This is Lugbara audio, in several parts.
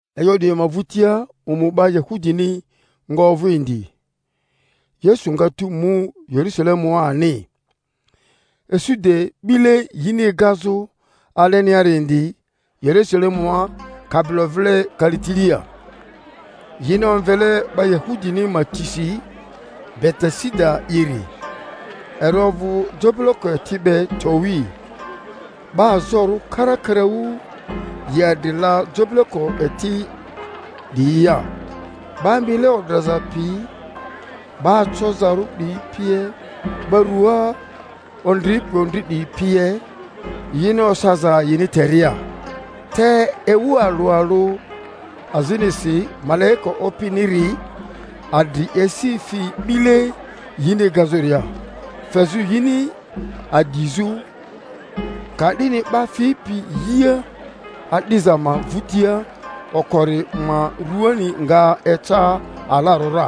E'yo 'diyi ma vᴜtia omu 'ba Yahudini nga ovᴜ indi; Yesu nga tu mu Yerusalemua ani. isu de 'bile yini egazᴜ aleniari indi Yerusalemua kabilo vile kalitilia, yini omvele 'ba Yahudini ma tisi Betesida'iri, eri ovᴜ jobileko eti be towi. 'Ba azorᴜ karakaraᴜ yi adri la jobileko eti 'diyia, 'ba mile odraza piyi, 'ba acozarᴜ 'diyi pie, 'ba rua ondripi ondri 'diyi pie, yini osaza yini teria. Te ewu alᴜ alᴜ azinisi malaika Opiniri adri esi fi 'bile yini egazᴜria, fezᴜ yini adizᴜ; ka'dini 'ba fipi yia adiza ma vᴜtia okori ma ruani nga eca alarᴜ ra,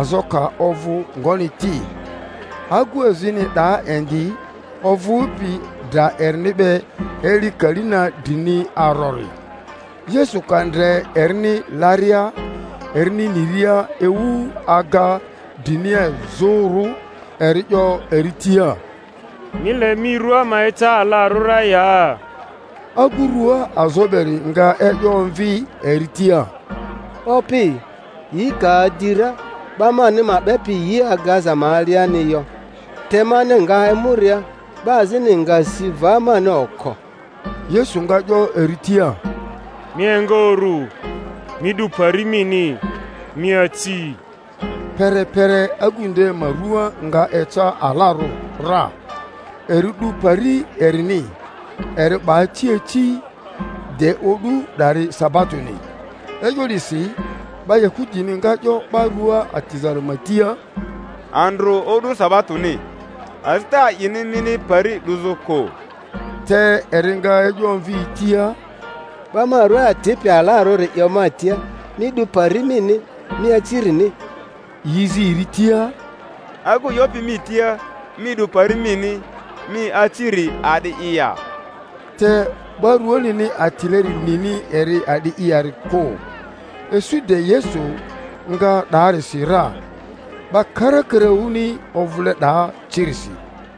azo ka ovᴜ ngoni ti. Agu azini 'daa indi ovᴜpi dra erini be eli kali na drini arori. Yesu ka ndre erini laria, erini niria ewu aga drinia izᴜrᴜ, eri 'yo eri tia, Mi le mi rua ma eca alarᴜ ra ya? Agu rua azo beri nga e'yo omvi eri tia, Opi, yi ka adi ra, 'ba mani ma 'bepi yi egaza ma aliani yo, te mani nga emuria, 'ba azini nga si va mani oko. Yesu nga 'yo eri tia, Mi enga uru, mi 'du pari mini, mi aci. Perepere agᴜ nde ma rua nga eca alarᴜ ra, eri 'du pari erini, eri 'ba aci aci. De o'du 'dari sabatoni. E'yo 'disi 'ba Yahudini nga 'yo 'ba rua atizari ma tia, Andrᴜ o'du sabatoni, azita a'ini mini pari 'duzᴜ kᴜ. Te eri nga e'yo omvi yi tia, 'Ba ma rua atipi alarᴜri 'yo ma tia, Mi 'du pari mini, mi acirini. Yi zi eri tia, Agu 'yopi mi tia, Mi 'du pari mini, mi aciri a'di'i ya? Te 'ba ruanini atileri nini eri a'di'i yari kᴜ; isu de Yesu nga 'daarisi ra, 'ba karakaraᴜni ovᴜle 'daa cirisi.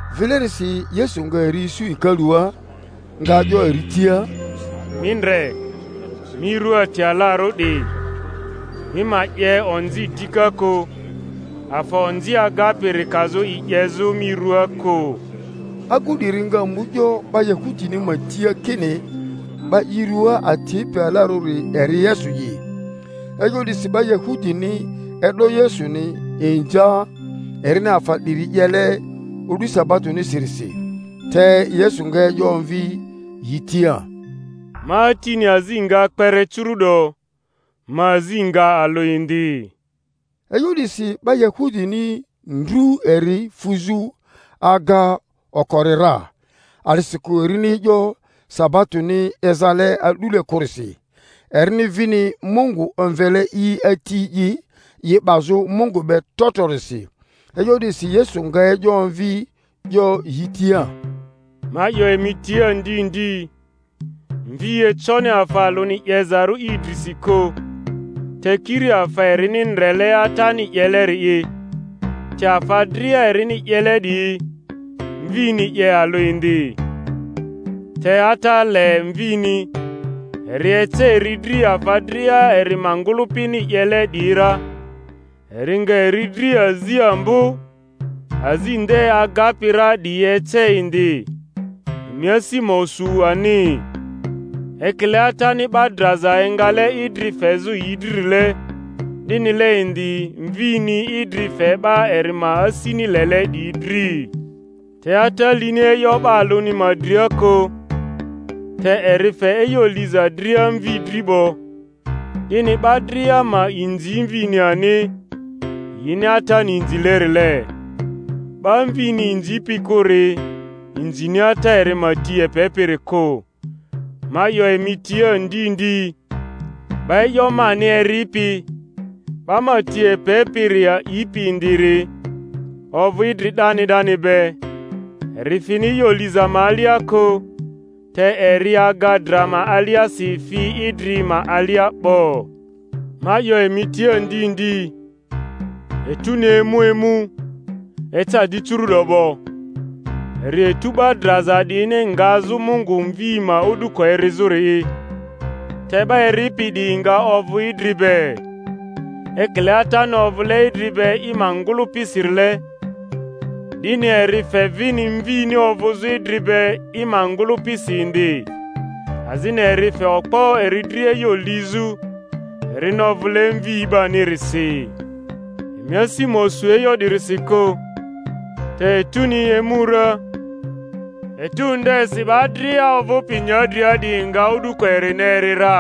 Vilerisi Yesu nga eri isu hekalua, nga 'yo eri tia, Mi ndre, mi rua ati alarᴜ 'di! Mi ma 'ye onzi dika kᴜ, afa onzi agapiri kazᴜ i 'yezᴜ mi ruaa kᴜ. Agu 'diri nga mu 'yo 'ba Yahudini ma tia kini 'ba i rua atipi alarᴜri eri Yesu'i. E'yo 'disi 'ba Yahudini e'do Yesuni inza, erini afa 'diri 'yele o'du sabatonisirisi. Te Yesu nga e'yo omvi yi tia, Ma Atini azi nga kpere curu'do, ma azi nga alᴜ indi. E'yo 'disi 'ba Yahudini ndru eri fuzᴜ aga okori ra, a'disikᴜ erini e'yo sabatoni ezale a'dule kᴜrisi, erini vini Mungu omvele i Ati'i, i 'bazᴜ Mungu bc trotrorisi. E'yo 'disi Yesu nga e'yo omvi 'yo yi tia, Ma 'yo emi tia ndi ndi, Mvi econi afa alᴜni 'yezarᴜ i drisi kᴜ, te kiri afa erini ndrele Atani 'yeleri'i; te afa dria erini 'yele 'diyi, Mvini 'ye alᴜ indi. Te Ata le Mvini, eri ece eri dri afa dria eri ma ngᴜlᴜpini 'yele 'diyi ra; eri nga eri dri azi ambo azi nde agapi ra 'diyi ece indi, emi asi ma osu ani. Ekile Atani 'ba draza engale idri fezᴜ yi dririle, 'dinile indi Mvini idri fe 'ba eri ma asini lele 'diyi dri. Te Ata lini e'yo 'ba alᴜni ma dria kᴜ, te eri fe e'yo liza dria Mvi dri 'bo, 'dini 'ba dria ma inzi Mvini ani, yini Atani inzilerile. 'Ba Mvini inzipi kᴜri inzini Ata eri ma ti epepiri kᴜ. Ma 'yo emi tia ndi ndi, 'ba e'yo mani eripi, 'ba ma ti epepiri a'ipi indiri, ovᴜ idri 'dani 'dani be, eri fini e'yo liza ma alia kᴜ, te eri aga dra ma aliasi fi idri ma alia 'bo. Ma 'yo emi tia ndi ndi, etᴜni emu emu, eca di curu'do 'bo, eri etu 'ba draza 'diyini ngazᴜ Mungu Mvi ma o'duko erizᴜri'i, te 'ba eripi 'diyi nga ovᴜ idri be. Ekile Atani ovᴜle idri be i ma ngᴜlᴜpi-sirile, 'dini eri fe vini Mvini ovᴜzᴜ idri be i ma ngᴜlᴜpisi indi, azini eri fe okpo eri dri e'yo lizᴜ, erini ovᴜle Mvi 'banirisi. Emi asi ma osu e'yo 'dirisi kᴜ; te etuni emu ra, etu ndesi 'ba dria ovᴜpi nyadria 'diyi nga o'duko erini eri ra,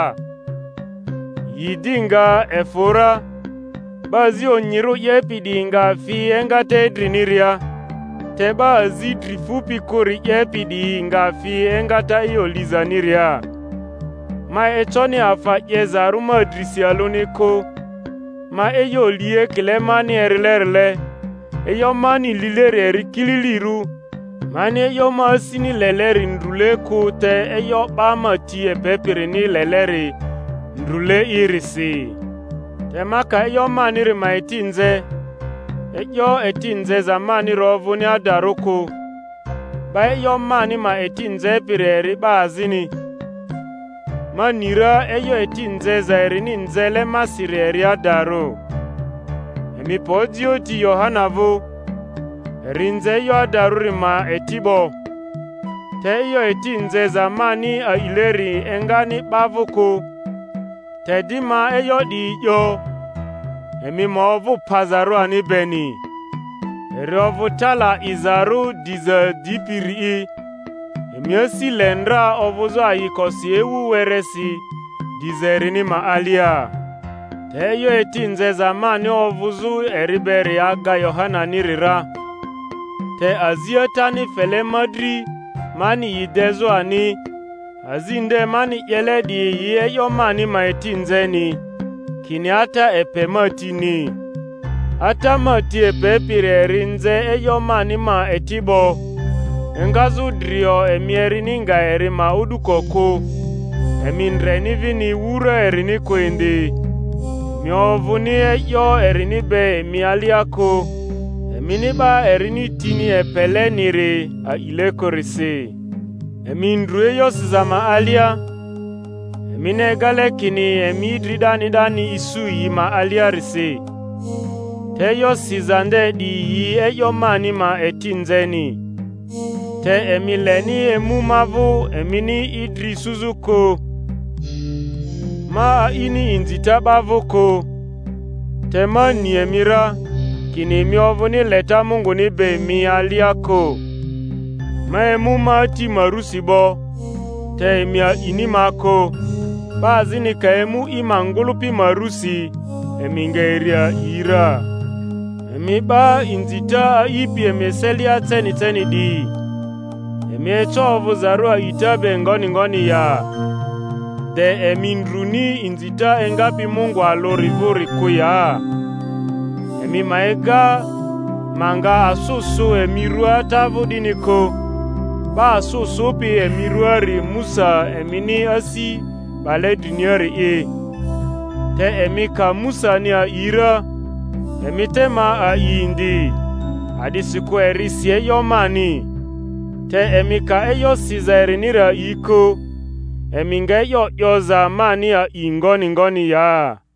yi di nga efᴜ ra, 'ba azi onyirᴜ 'yepi 'diyi nga fi engata idriniria, te 'ba azi dri fupi kᴜri 'yepi 'diyi nga fi engata e'yo lizaniria. Ma econi afa 'yezarᴜ ma drisi alᴜni kᴜ; ma e'yo li ekile mani erilerile; e'yo mani lileri eri kililirᴜ, mani e'yo ma asini leleri ndrule kᴜ te e'yo 'ba ma ti epepirini leleri ndrᴜle'irisi. Te ma ka e'yo maniri ma eti nze, e'yo eti nzeza maniri ovᴜni adarᴜ kᴜ; 'ba e'yo mani ma eti nzepiri eri 'ba azini, ma ni ra e'yo eti nzeza erini nzele masiri eri adarᴜ. Emi pe ojioᴜ ti Yohana vᴜ, eri nze e'yo adarᴜri ma eti 'bo. Te e'yo eti nzeza mani a'ileri engani 'ba vᴜ kᴜ; te di ma e'yo 'diyi 'yo, emi ma ovᴜ pazarᴜ ani beni. Eri ovᴜ tala 'izarᴜ diza dipiri'i, emi asi le ndra ovᴜzᴜ ayikosi ewu weresi diza erini ma alia. Te e'yo eti nzeza mani ovᴜzᴜ eri beri aga Yohananiri ra; te azi Atani fele ma dri mani yi dezᴜ ani, azi nde mani 'yele 'diyi yi e'yo mani ma eti nzeni, kini Ata epe ma tini. Ata ma ti epepiri eri nze e'yo mani ma eti 'bo. Engazᴜ drio emi erini nga eri ma o'duko kᴜ, emi ndreni vini wura erini kᴜ indi; emi ovᴜni e'yo erini be emi alia kᴜ, emini 'ba erini tini epeleniri a'ile kᴜrisi. Emi ndru e'yo siza ma alia, emini egale kini emi idri 'dani 'dani isu yi ma aliarisi; te e'yo siza nde 'diyi yi e'yo mani ma eti nzeni; te emi leni emu ma vᴜ emini idri isuzᴜ kᴜ. Ma a'ini inzita 'ba vᴜ kᴜ. Te ma ni emi ra, kini emi ovᴜni leta Munguni be emi alia kᴜ. Ma emu ma Ati ma rusi 'bo, te emi a'ini ma kᴜ; 'ba azini ka emu i ma ngᴜlᴜpi ma rusi, emi nga eri a'i ra. Emi 'ba inzita a'ipi emi eselia ceni ceni 'diyi, emi eco ovᴜzarᴜ a'ita be ngoni ngoni ya, de emi ndruni inzita engapi Mungu alᴜri vᴜri kᴜ ya? Emi ma ega ma nga asᴜ sᴜ emi ruaa Ata vᴜ 'dini kᴜ; 'ba asᴜ sᴜpi emi ruaari Musa emini asi 'bale driniari'i. Te emi ka Musani a'i ra, emi te ma a'i indi, a'disikᴜ eri si e'yo mani. Te emi ka e'yo siza eriniri a'i kᴜ, emi nga e'yo 'yoza mani a'i ngoni ngoni ya?